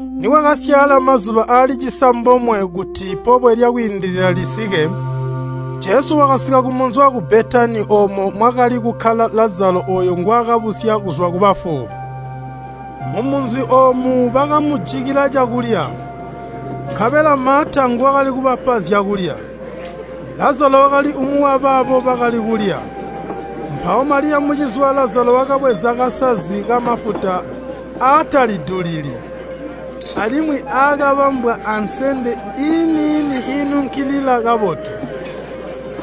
Nikwakasyaala mazuba aali cisambomwe kuti Pobwe lya Kwiindilila lisike, Jesu wakasika kumunzi waku Betani oomo mwakali kukkala Lazalo ooyo ngwaakabusya kuzwa kubafu. Mumunzi oomu bakamujikila cakulya, nkabela Maata nguwakali kubapa zyakulya. Lazalo wakali umwi wabaabo bakali kulya. Mpawo Maliya mucizi wa Lazalo wakabweza kasazi kamafuta aatalidulili, alimwi aakabambwa ansende iini-ini iinunkilila kabotu,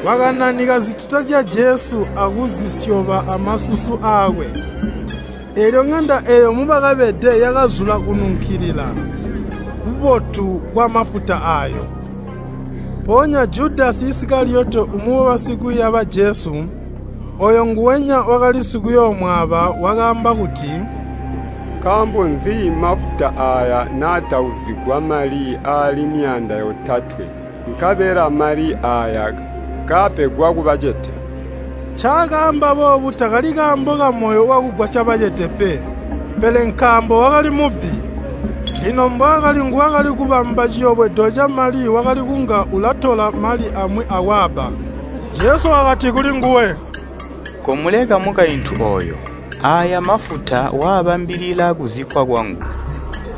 wakananika zituta zya Jesu akuzisyoba amasusu aakwe. Eelyo ŋanda eeyo mubakabede yakazula kununkilila kubotu kwamafuta aayo. Mpoonya Judasi Isikaliyoti umwi wabasikwiiya ba Jesu (ooyo nguwenya wakali sikuyooomwaaba) wakaamba kuti, “Nkaambo nzi mafuta aaya naatauzigwa mali aali myaanda yotatwe, nkabela mali aaya kaapegwa kubacete?” Ncaakaamba boobu takali kaambo kamoyo wakugwasya bacete pe, pele nkaambo wakali mubbi, lino mbwaakali nguwakali kubamba ciyobwedo camali wakali kunga ulatola mali amwi akwaabba. Jesu wakati kulinguwe, “Komuleka mukaintu ooyo. Aaya mafuta waabambilila kuzikkwa kwangu.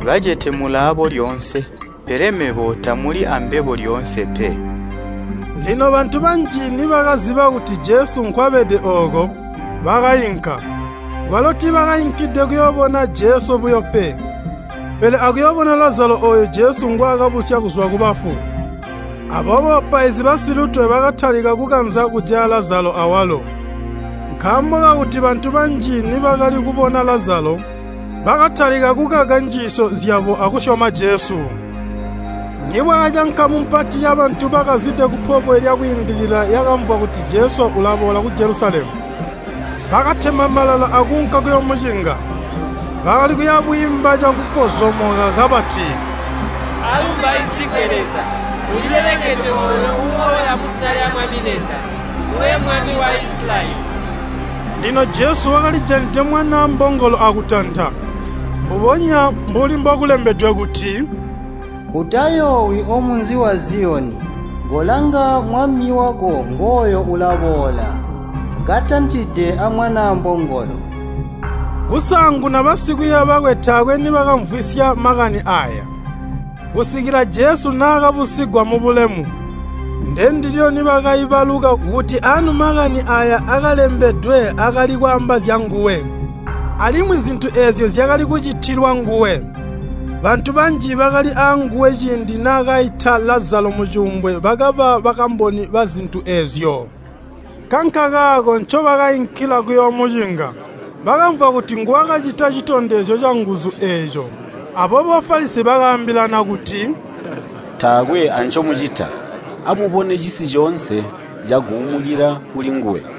Bacete mulaabo lyoonse, pele mebo tamuli ambebo lyoonse pe.” Lino bantu banji nibakaziba kuti Jesu nkwabede ooko, bakainka, kwalo tiibakainkilide kuyoobona Jesu buyo pe, pele akuyoobona Lazalo ooyo Jesu ngwaakabusya kuzwa kubafu. Aboobo bapaizi basilutwe bakatalika kukanza kujaya Lazalo awalo, nkaambo kakuti bantu banji nibakali kubona Lazalo, bakatalika kukaka njiisyo zyabo akusyoma Jesu. Nibwakaca nkamu mpati yabantu bakazide ku Pobwe lya Kwiindilila yakamvwa kuti Jesu ulaboola ku Jelusalemu. Bakatema malala akuunka kuyoomucinga. Bakali kuya bwiimba cakupozomoka kabati, “Aalumbaizigwe Leza! Ulilelekedwe ooyo uuboola muzina lya Mwami Leza, nguwe Mwami wa Isilayeli!” Lino Jesu wakalijanide mwanaa mbongolo akutanta, mbubonya mbuli mbokulembedwe kuti, “Utayoowi omunzi wa Ziyoni, kolanga Mwami wako ngooyo ulaboola, katantide amwanaa mbongolo!” Kusaanguna basikwiiya bakwe taakwe nibakaamvwisya makani aaya, kusikila Jesu naakabusigwa mubulemu. Ndendilyo nibakaibaluka kuti anu makani aaya akalembedwe akali kwaamba zyanguwe, alimwi zintu eezyo zyakali kucitilwa nguwe. Bantu banji bakali aanguwe ciindi naakaita Lazalo mucuumbwe bakaba bakamboni bazintu eezyo. Nkankakaako ncobakainkila kuyoomucinga, bakamvwa kuti nguwakacita citondezyo canguzu eeco. Aboobo Bafalisi bakaambilana kuti, “Taakwe ancomucita! Amubone, cisi coonse caguumukila kulinguwe.”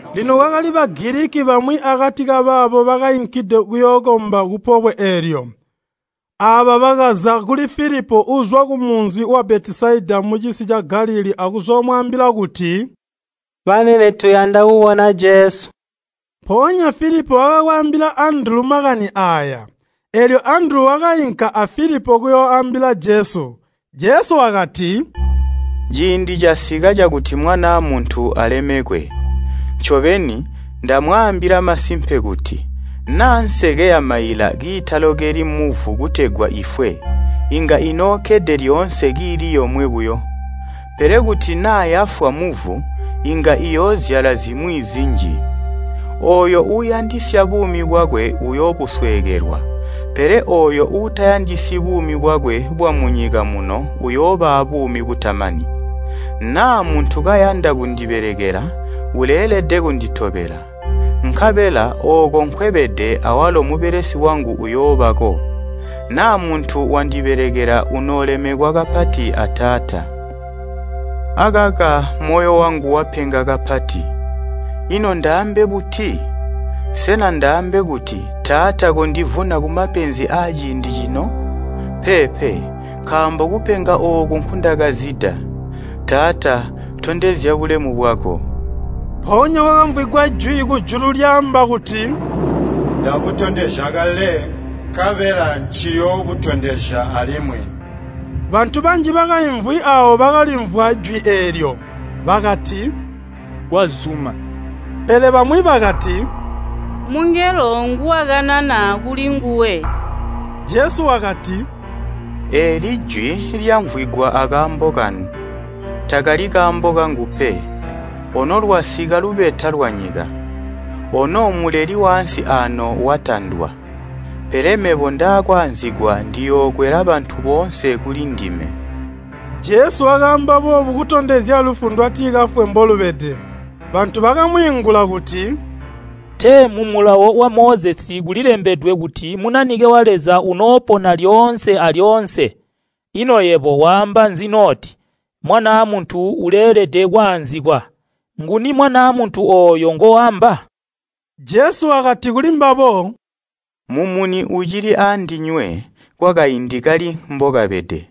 Lino kwakali Bagiliki bamwi akati kabaabo bakainkide kuyookomba kupobwe eelyo. Aaba bakaza kuli Filipo uuzwa kumunzi wa Betesaida mucisi ca Galilii akuzoomwaambila kuti, “Banene tuyanda kubona Jesu.” Mpoonya Filipo wakaakwaambila Andulu makani aaya, eelyo Andulu wakainka a Filipo kuyooambila Jesu. Jesu wakati, “Ciindi casika cakuti Mwanaa Muntu alemekwe. Ncobeni, ndamwaambila masimpe kuti, naa nseke yamaila kiitalokeli muvu kutegwa ifwe, inga inookkede lyoonse kiili yomwe buyo. Pele kuti naa yafwa muvu, inga iyoozyala zimwi zinji. Ooyo uuyandisya buumi bwakwe uyoobusweekelwa, pele ooyo utayandisyi buumi bwakwe bwamunyika muno uyooba abuumi butamani. Naa muntu kayanda kundibelekela, uleelede kunditobela, nkabela ooko nkwebede awalo mubelesi wangu uyoobako. Naa muntu wandibelekela unoolemekwa kapati a Taata. “Akaka moyo wangu wapenga kapati. Ino ndaambe buti? Sena ndaambe kuti, ‘Taata, kondivuna kumapenzi aaciindi cino?’ Peepe, nkaambo kupenga ooku nkundakazida. Taata, ‘Tondezya bulemu bwako.’” Mpoonya kwakamvwigwa jwi kujulu lyaamba kuti, “Ndabutondezya kale, nkabela nciyoobutondezya alimwi.” Bantu banji bakaimvwi aawo bakalimvwa jwi eelyo, bakati, “Kwazuma.” Pele bamwi bakati, “Mungelo nguwakanana kulinguwe.” Jesu wakati, “Eeli jwi lyamvwigwa akaambo kanu, takali kaambo kangu pe. Ono lwasika lubeta lwanyika, ono muleli waansi aano watandwa. Pele mebo ndakwaanzikwa ndiyookwela bantu boonse kulindime.” Jesu wakaamba boobu kutondezya lufu ndwatikafwe mbolubede. Bantu bakamwiingula kuti, “Tee mu Mulawo wa Mozesi kulilembedwe kuti Munanike wa Leza unoopona lyoonse alyoonse. Ino yebo waamba nzi noti ‘Mwanaa Muntu uleelede kwaanzikwa?’ Nguni Mwanaa Muntu ooyo ngoamba?” Jesu wakati kulimbabo, “Mumuni ucili aandinywe kwakaindi kali mbokabede.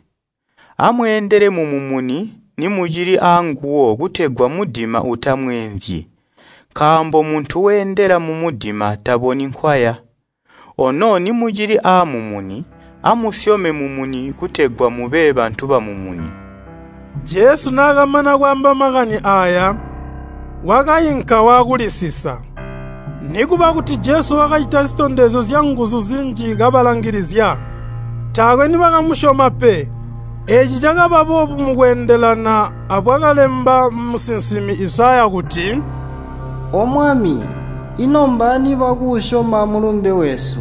Amweendele mumumuni nimucili aanguwo kutegwa mudima utamweenzyi, nkaambo muntu weendela mumudima taboni nkwaya. Ono nimucili aamumuni, amusyome mumumuni kutegwa mube bantu bamumuni.” Jesu naakamana kwaamba makani aaya, wakainka waakulisisa. Nikuba kuti Jesu wakacita zitondezyo zyanguzu zinji kabalangilizya, taakwe nibakamusyoma pe. Eeci cakaba boobu mukweendelana abwakalemba musinsimi Izaya kuti, “O Mwami, ino mbaani bakuusyoma mulumbe wesu,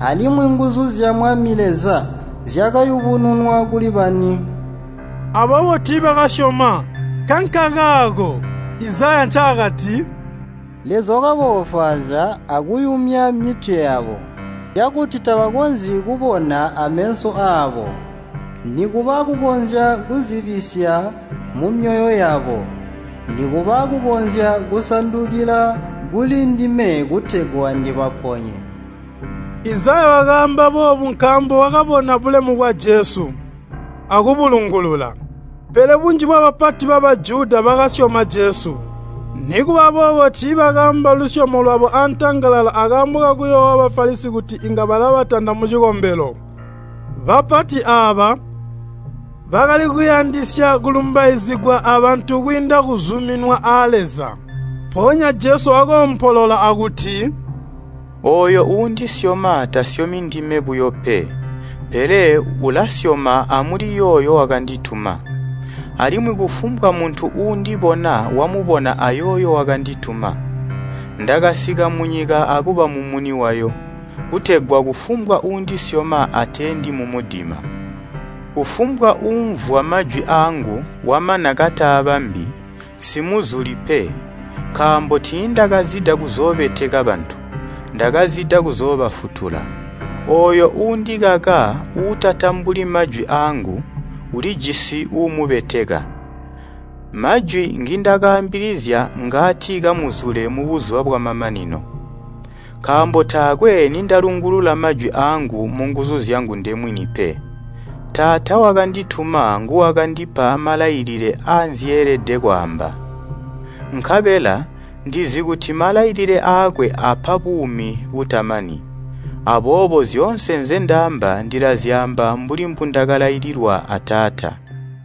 alimwi nguzu zya Mwami Leza zyakayubununwa kuli bani?” Aboobo tiibakasyoma. Nkankakaako Izaya ncaakati, “Leza wakaboofwaazya akuyumya mitwe yabo, cakuti tabakonzyi kubona ameso aabo, nikuba kukonzya kuzibisya mumyoyo yabo, nikuba kukonzya kusandukila kuli ndime kutegwa ndibaponye.” Izaya wakaamba boobu nkaambo wakabona bulemu bwa Jesu, akubulungulula. Pele bunji bwabapati ba Bajuda bakasyoma Jesu. Nikuba boobo tiibakaamba lusyomo lwabo antangalala akaambo kakuyoowa Bafalisi kuti inga balabatanda mucikombelo. Bapati aaba, bakali kuyandisya kulumbaizigwa abantu kwiinda kuzuminwa a Leza. Mpoonya Jesu wakoompolola akuti, “Ooyo uundisyoma tasyomi ndime buyo pe, pele ulasyoma amuliyooyo wakandituma. Alimwi kufumbwa muntu uundibona wamubona ayooyo wakandituma. Ndakasika munyika akuba mumuni wayo, kutegwa kufumbwa uundisyoma ateendi mumudima. Kufumbwa uumvwa majwi aangu wamana kataabambi, nsimuzuli pe, nkaambo tiindakazida kuzoobeteka bantu, ndakazida kuzoobafutula. Ooyo uundikaka uutatambuli majwi aangu, ulijisi uumubeteka. Majwi ngindakaambilizya ngaati kamuzule mubuzuba bwamamanino. Nkaambo taakwe nindalungulula majwi aangu munguzu zyangu ndemwini pe. Taata wakandituma nguwakandipa malailile aanzyeelede kwaamba. Nkabela ndizi kuti malailile aakwe apa buumi butamani. Aboobo zyoonse nzendaamba ndilazyaamba mbuli mbundakalaililwa a Taata.”